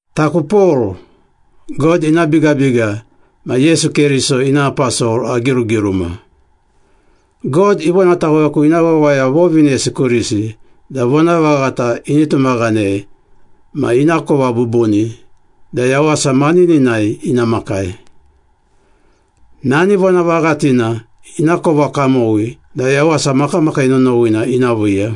Taku Pol, God ina bigabiga ma Yesu Keriso ina aposol agirugiruma. God ivonataweku ina wawaya vovinesi kurisi da vonavaghata ini tumaghanei ma inakova bubuni da yawasa manininai ina makai. Nani vonavaghatina inakova kamowi da yawasa makamakii nonowina ina viiya.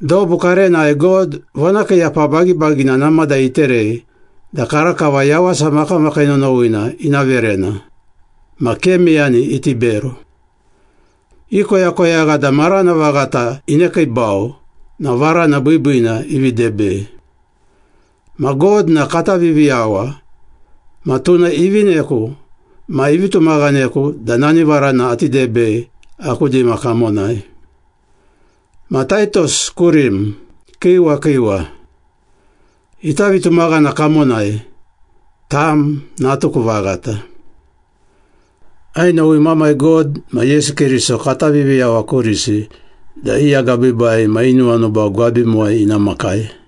Dobu karenai God vonakiiyapa bagibagina namada iterei da karakava yawasa makamakii nonowina ina verena, ma ke meyani iti bero. Ikoyakoyagha da marana vaghata inekiibau na varana biibiina ivi debei. Ma God na kata Viviyawa ma tuna ivineku ma ivi tumaghaneku da nani varana ati debei aku dima kamonai. Ma Taitos kurim, kiiwa kiiwa. Ita vitumaghana kamonai, tam natuku vaghata. Ainowi Mamai God ma Yesu Keriso kata Viviyawa kurisi da i agabiibai ma i nuwanuba gwabimuwai ina makai.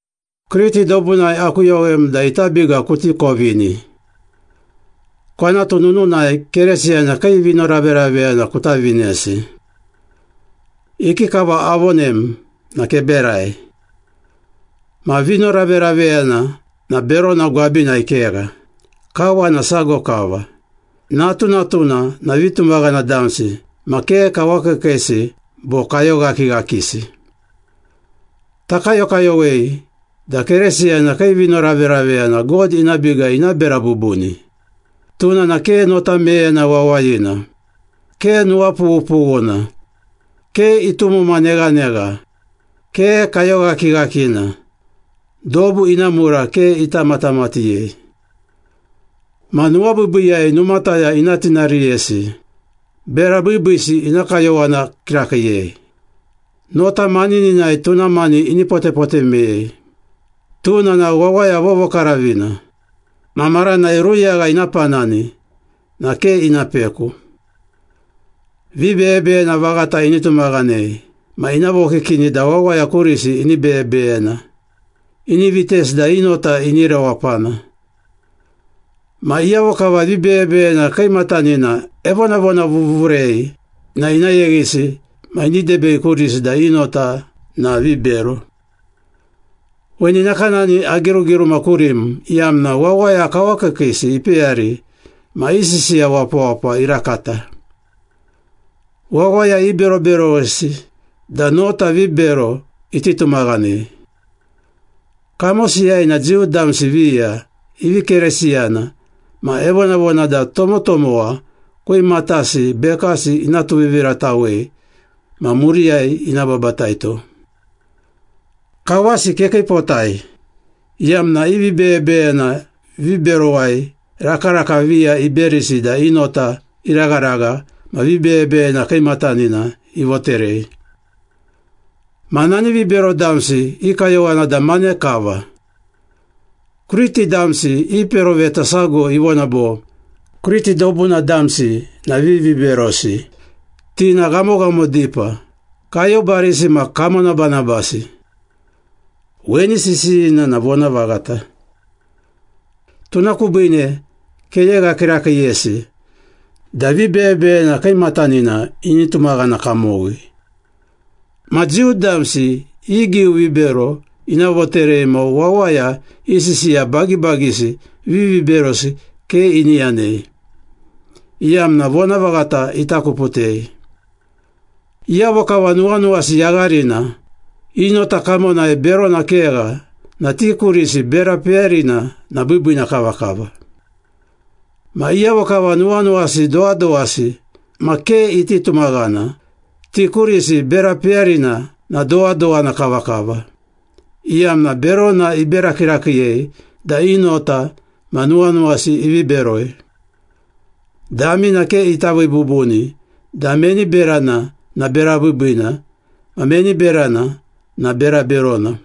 Kriti dobunai akuyowem da ita biga kuti kovini. Kwanatu nununai Keresiyana kii vinoraveraveyana kuta vinesi. Ikikava avonem na keberai. Ma vinoraveraveyana na berona gwabinai kegha, kawana sago kava, natunatuna na vitumaghana damsi ma ke kawakiikiisi bo kayoghakighakisi. Takayokayowei da Keresiyana kii vinoraveraveyana God ina biga ina bera bubuni, tuna na ke nota meyena wawayina, ke nuwapughupughuna, ke itumuma neghanegha, ke kayoghakighakina, dobu ina mura ke ita matamatighei. Ma nuwabiibiiyai numataya ina tinariyesi, bera biibiisi ina kayowana kirakiiyei, nota manininai tuna mani ini potepote meyei, tuna na wawaya vovokaravina, ma maranai ruyagha ina panani na ke ina peku. Vibeyebeyena vaghata ini tumaghanei ma ina vokikini da wawaya kurisi ini beyebeyena, ini vitesi da i nota ini rewapana. Ma iyavo kava vibeyebeyena kiimatanina evonavonavuvurei na ina yeghisi ma ini debei kurisi da i nota na vibero. Weni nakanani agirugiruma kurim iyamna wawaya kawakiikiisi ipeyari ma i sisiya wapawapa irakata. Wawaya iberoberowesi da nota vibero iti tumaghanei. Kamosiyai na Jiu damsi viya ivi Keresiyana ma evonavona da tomotomowa kwimatasi bekasi ina tuviviratawei ma muriyai ina babataito. Kawasi kekiipotai, iyamna i vibeyebeyena viberowai rakaraka viya iberisi da i nota iragharagha ma vibeyebeyena kiimatanina ivoterei. Ma nani vibero damsi i kayowana da mane kava. Kriti damsi i peroveta sago ivona bo, “Kriti dobuna damsi na viviberosi, ti na ghamoghamo dipa, kayobarisi ma kamonabanabasi.” Weni sisiyina na vonavaghata. Tuna kubiine keyegha kirakiiyesi da vibeyebeyena kiimatanina ini tumaghana kamowi, ma Jiu damsi i giu vibero ina voterei ma wawaya i sisiya bagibagisi viviberosi ke ini yanei, iyamna vonavaghata itakuputei. Iyavo kava nuwanuwasi yagharina, i nota kamonai berona kegha na ti kurisi bera peyarina na biibiina kavakava. Ma iyavo kava nuwanuwasi dowadowasi ma ke iti tumaghana, ti kurisi bera peyarina na dowadowana kavakava, iyamna berona ibera kirakiiyei da i nota ma nuwanuwasi ivi beroi. Damina ke ita vii bubuni da meni berana na bera biibiina ma meni berana na bera berona.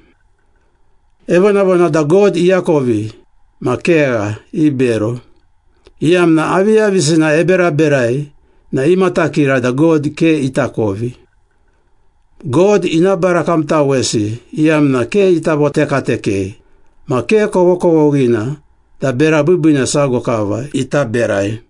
Evonavona da God iakovi ma kegha ibero, iyamna aviyavisina eberaberai na imatakira da God ke itakovi. God ina barakamtawesi iyamna ke ita votekatekei ma ke kovokovoghina da bera biibiina sago kava ita berai.